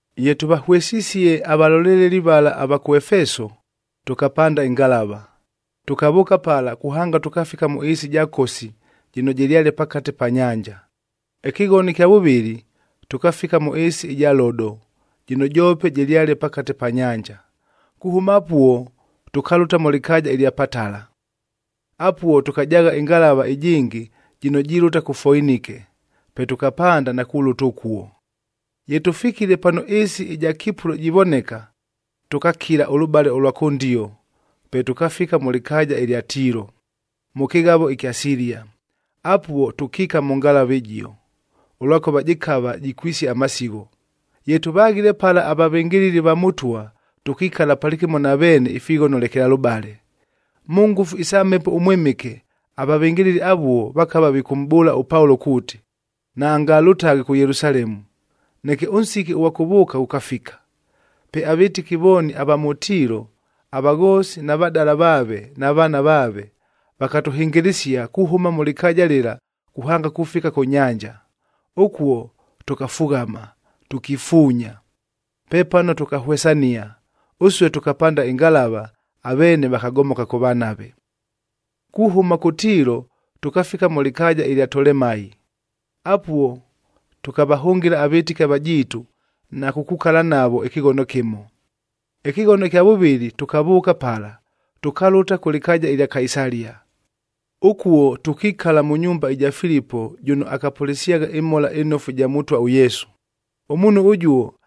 Ye tʉvahwesisie avaloleleli vala ava kʉ Efeso, tʉkapanda ɨngalava, tʉkavʉʉka pala kuhanga tʉkafika mʉ ɨɨsi ɨja Kosi, jɨno jɨlyale pakate pa nyanja. Ɨkɨghono ɨkya vʉvɨlɨ, tʉkafika mʉ ɨɨsi ɨja Lodo jɨno joope jɨlyale pakate pa nyanja. Kuhʉma apuo tʉkalʉta mʉ lɨkaaja ɨlya Patala. Apuo tʉkajaagha ɨngalava ɨjɨngɨ jɨno jilʉta kʉ Foinike, pe tʉkapanda na kulʉta ʉkuo. Ye tʉfikile pano ɨɨsi ɨja Kipulo jivoneka, tʉkakila ʉlʉbale ʉlwa kʉndio, pe tʉkafika mʉ lɨkaaja ɨlya Tiilo, mʉ kɨghavo ɨkya Silia. Apuo tʉkiika mʉ ngalava ɨjio, ʉlwakʉva jɨkava jikwisia amasigho. Ye tʉvaghile pala avavɨngɨlɨli va Mʉtwa, tʉkikala palɨkɨmo na veene ifighono lekelalʉbale. Mʉ ngʉfu isa Mhepo ʉMwɨmɨke, avavɨngɨlɨli avuo vakava vikʉmʼbʉʉla ʉPaulo kuuti, naangalʉtaghe kʉ Yelusalemu. Neke ʉnsiki ʉghwa kʉvʉʉka ghʉkafika. Pe avɨtɨki vooni ava mʉ Tiilo, avaghoosi na vadala vaave na vaana vaave, vakatʉhɨngɨlɨsia kuhʉma mʉ lɨkaaja lɨla kuhanga kufika kʉ nyanja. Ʉkuo tʉkafughama, tʉkifuunya. Pepano tʉkahwesania, ʉsue tʉkapanda ɨngalava, aveene vakagomoka kʉvanave. Kuhʉma kʉ Tiilo tʉkafika mʉ lɨkaaja ɨlya Tolemai, apuo tʉkavahʉngɨla avɨtɨki avajiitu na kukukala navo ɨkɨghono kɨmo. Ɨkɨghono ɨkya vʉvɨlɨ tʉkavʉʉka pala, tʉkalʉta kʉ lɨkaaja ɨlya Kaisalia. Ʉkuo tʉkikala mʉ nyumba ɨja Filipo jʉno akapʉlɨsyagha ɨMhola ɨNofu ɨja Mʉtwa ʉYesu. Ʉmuunhu ʉjuo,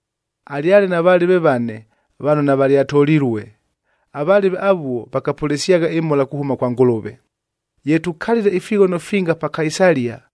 Alyale na valɨve vane, vano navalyatolilue. Avalɨve avuo vakapʉlɨsyagha ɨmhola kuhʉma kwa Ngʉlʉve. Ye tukalile ifighono finga pa Kaisalia,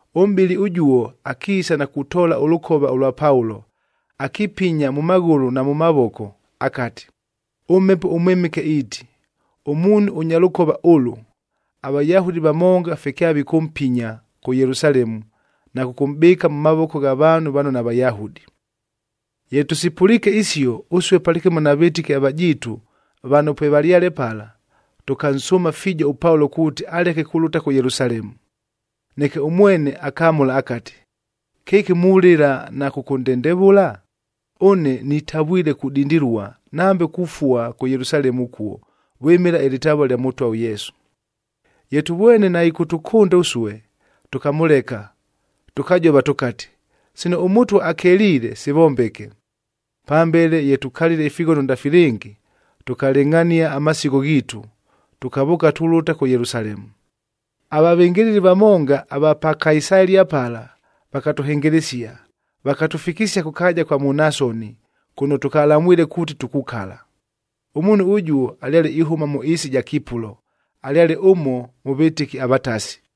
Ʉmʼbɨli ʉjuo akiisa na kutoola ʉlʉkova ʉlwa Paulo, akipinya mʉ maghʉlʉ na mʉ mavoko akati, “ɄMhepo ʉMwɨmɨke iiti, ‘Ʉmuunhu ʉnya lʉkova ʉlʉ, aVayahudi vamonga fye kyavikʉmpinya kʉ Yelusalemu na kʉkʉmʼbɨɨka mʉ mavoko gha vaanhu vano naVayahudi.’” Ye tʉsipʉliike isio, ʉsue palɨkɨmo na vɨtɨki avajiitu vano pwevalyale pala, tʉkansʉʉma fiijo ʉPaulo kuuti aleke kulʉta kʉ Yelusalemu. Neke ʉmwene akamʉla akati, “Kɨki mulɨla na kʉkʉndendevʉla? Ʉne nitavwile kudindilua, nambe kufua kʉ Yelusalemu ʉkuo vwɨmɨla ɨlɨtavua lya Mʉtwa ʉYesu.” Ye tʉvwene naɨkʉtʉkʉnda ʉsue, tʉkamʉleka, tʉkajova tʉkati, “Sino ʉMʉtwa akeliile, sivombeke.” Pambele ye tukalile ifighono ndafilɨngi, tʉkalɨngʼhania amasigho ghiitu, tʉkavʉʉka tulʉta kʉ Yelusalemu. Avavɨngɨlɨli vamonga ava pa Kaisalia pala, vakatʉhɨngɨlɨsia, vakatʉfikisia kʉ kaaja kwa Munasoni, kʉno tʉkalamwile kuuti tukukala. Ʉmuunhu ʉjuo alyale ihʉma mʉ ɨɨsi ɨja Kipulo, alyale ʉmo mʉ vɨtɨki avatasi.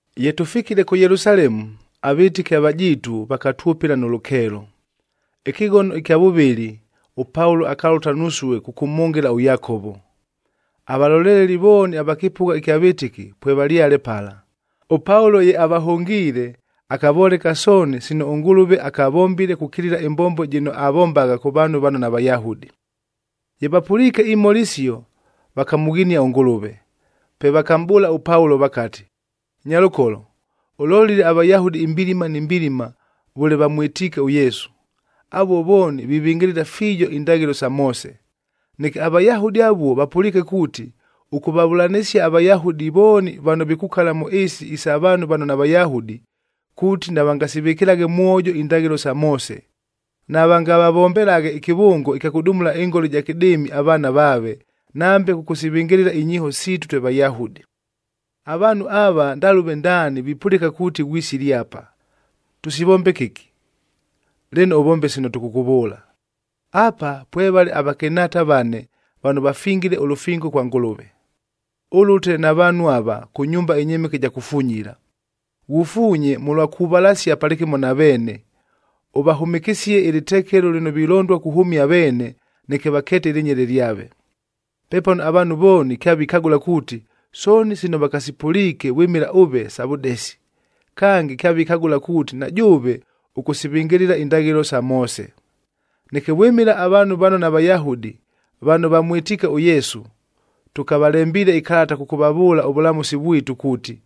Ye tʉfikile kʉ Yelusalemu, avɨtɨki avajiitu vakatwʉpɨla nʉ lʉkeelo. Ɨkɨghono ɨkya vʉvɨlɨ ʉPaulo akalʉta nusue kʉkʉmhʉngɨla ʉYakovo. Avaloleleli vooni ava kɨpʉgha ɨkya vɨtɨki pwevalyale pala. ɄPaulo ye avahʉngiile, akavoleka sooni sino ʉNgʉlʉve akavombile kukilila ɨmbombo jɨno avombagha kʉ vaanhu vano naVayahudi. Ye vapʉliike imhola isio, vakamʉghinia ʉNgʉlʉve. Pe vakamʼbʉʉla ʉPaulo vakati, “Nyalʉkolo, ʉlolile aVayahudi imbilima ni mbilima vʉle vamwɨtiike ʉYesu. Avuo vooni vivɨngɨlɨla fiijo indaghɨlo sa Moose. Neke aVayahudi avuo vapʉliike kuuti, ʉkʉvavʉlanɨsia aVayahudi vooni vano vikukala mʉ ɨɨsi isa vaanhu vano naVayahudi, kuuti navangasivɨkɨlaghe mwojo indaghɨlo sa Moose, navangavavombelaghe ɨkɨvʉngo ɨkya kʉdumula ɨngola ɨja kɨdɨɨmi avaana vaave,c nambe kʉkʉsivɨngɨlɨla inyiiho siitu twe Vayahudi. Avaanhu ava ndalʉve ndaani vipʉlɨka kuuti ghwisile apa. Tʉsivombe kɨki! Lɨno, ʉvombe sino tʉkʉkʉvʉʉla. Apa pwevale avakɨnhaata vane vano vafingile ʉlʉfingo kwa Ngʉlʉve. Ʉlʉte na vaanhu ava, kʉ nyumba ɨnyɨmɨke ɨja kufunyila, ghufuunye mʉlwa kuvalasia palɨkɨmo na veene,e ʉvahʉmɨkɨsie ɨlɨtekelo lɨno vilondua kuhʉmia aveene neke vakeete ɨlɨnyele lyave.d Pepano avaanhu vooni kyavikagʉla kuuti, sooni sino vakasipʉliike vwɨmɨla ʉve sa vʉdesi. Kange, kyavikagʉla kuuti na jʉʉve ʉkʉsivɨngɨlɨla indaghɨlo sa Moose. Neke vwɨmɨla avaanhu vano naVayahudi vano vamwɨtiike ʉYesu, tʉkavalembiile ɨkalata kʉkʉvavʉʉla ʉvʉlamʉsi vwitu kuuti,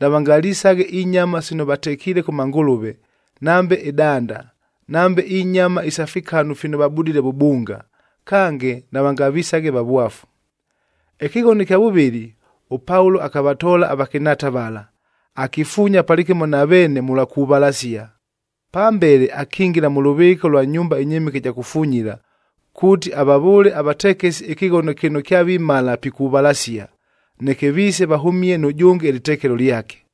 navangalisaghe inyama sino vatekiile kʉ mangʉlʉve, nambe ɨdanda, nambe inyama isa fikanu fino vabudile vʉbunga, kange navangavisaghe vavwafu.” Ɨkɨghono ɨkya vʉvɨlɨ, ʉPaulo akavatoola avakɨnhaata vala, akifuunya palɨkɨmo na veene mʉlwa kuvalasia. Pambele akingila mʉ lʉvɨɨka ʉlwa nyumba ɨnyɨmɨke ɨja kufunyila, kuuti avavʉʉle avatekesi ɨkɨghono kɨno kyavimala pikuvalasia, neke viise vahʉmie nʉjʉnge ɨlɨtekelo lyake.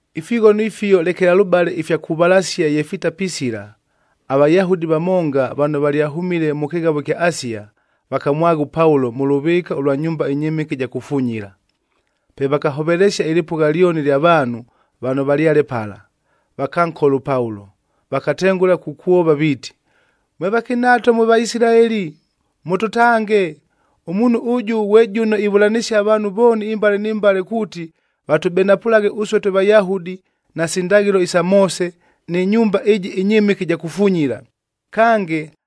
Ifighono ifio lekelalʉbale ifya kuvalasia ye fitapisila, aVayahudi vamonga vano valyahʉmile mʉ kɨghavo ɨkya Asia vakamwagha ʉPaulo mʉ lʉvɨɨka ʉlwa nyumba ɨnyɨmɨke ɨja kufunyila. Pe vakahovelesia ɨlɨpʉgha lyoni ɨlya vaanhu vano valyale pala, vakankola ʉPaulo, vakatengʉla kukwova viiti, “Mwe vakɨnhaata mwe Vaisilaeli, mʉtʉtange! Ʉmuunhu ʉjʉ ghwe jʉno ivʉlanɨsia avaanhu vooni imbale ni mbale kuuti, vatʉbenapʉlaghe ʉsue twe Vayahudi, nasi ndaghɨlo isa Moose, nɨ nyumba ɨjɨ ɨnyɨmɨke ɨja kufunyila. Kange,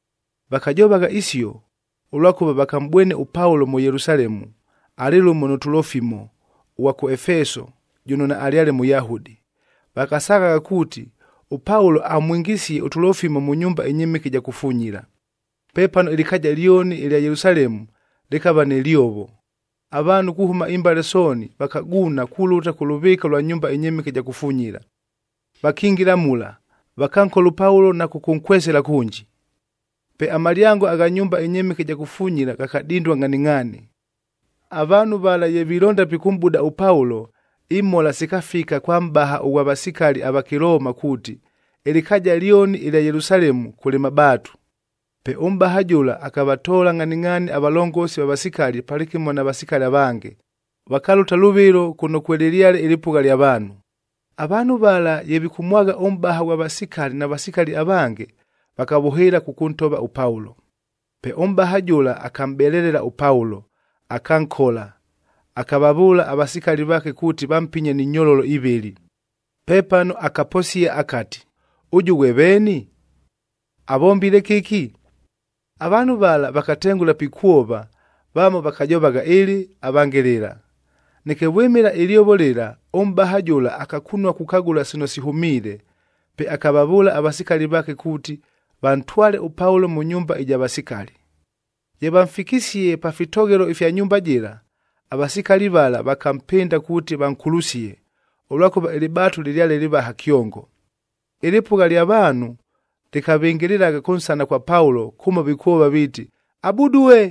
Vakajovagha isio, ʉlwakʉva vakamʼbwene ʉPaulo mʉ Yelusalemu, alɨ lʉmo nʉ Tulofimo ʉghwa kʉ Efeso jʉno naalyale Mʉyahudi. Vakasaagha kuuti, ʉPaulo amwingisie ʉTulofimo mʉ nyumba ɨnyɨmɨke ɨja kufunyila. Pepano ɨlɨkaaja lyoni ɨlya Yelusalemu lɨkava nɨ lyovo. Avaanhu kuhʉma imbale sooni vakaguuna kulʉta kʉ lʉvɨɨka ʉlwa nyumba ɨnyɨmɨke ɨja kufunyila. Vakingila mula, vakankola ʉPaulo na kʉkʉnkwesela kʉnji. Pe amalyango agha nyumba ɨnyɨmɨke ɨja kufunyila ghakadindua ngʼhaningʼhaani. Avaanhu vala ye vilonda pikʉmʼbuda ʉPaulo, imhola sikafika kwa mʼbaha ʉghwa vasikali ava Kɨlooma kuuti, ɨlɨkaaja lyoni ɨlya Yelusalemu kʉlɨ mabaatu. Pe ʉmʼbaha jʉla akavatoola ngʼhaningʼhaani avalongosi va vasikali palɨkɨmo na vasikali avange, vakalʉta lʉvɨlo kʉno kwelɨlyale ɨlɨpʉgha lya vaanhu. Avaanhu vala ye vikʉmwagha ʉmʼbaha ghwa vasikali na vasikali avange, vakavʉhɨɨla kʉkʉntova ʉPaulo. Pe ʉmʼbaha jʉla akamʼbelelela ʉPaulo, akankola, akavavʉʉla avasikali vaake kuuti vampinye ni nyololo ivɨlɨ. Pepano akaposia akati, “Ʉjʉ ghwe veeni? Avombile kɨki?” Avaanhu vala vakatengʉla pikwova, vamo vakajovagha ɨlɨ, avange lɨla. Neke vwɨmɨla ɨlyovo lɨla, ʉmʼbaha jʉla akakunua kukagʉla sino sihʉmiile. Pe akavavʉʉla avasikali vaake kuuti, vantwale ʉPaulo mʉ nyumba ɨja vasikali. Ye vamfikisie pa fitoghelo ifya nyumba jɨla, avasikali vala vakampɨnda kuuti vankulusie, ʉlwakʉva ɨlɨbaatu lɨlyale lɨvaha kyongo. Ɨlɨpʉgha lya vaanhu lɨkavɨngɨlɨlagha kʉnsana kwa Paulo kʉmo vikwova viiti, “Abudue!”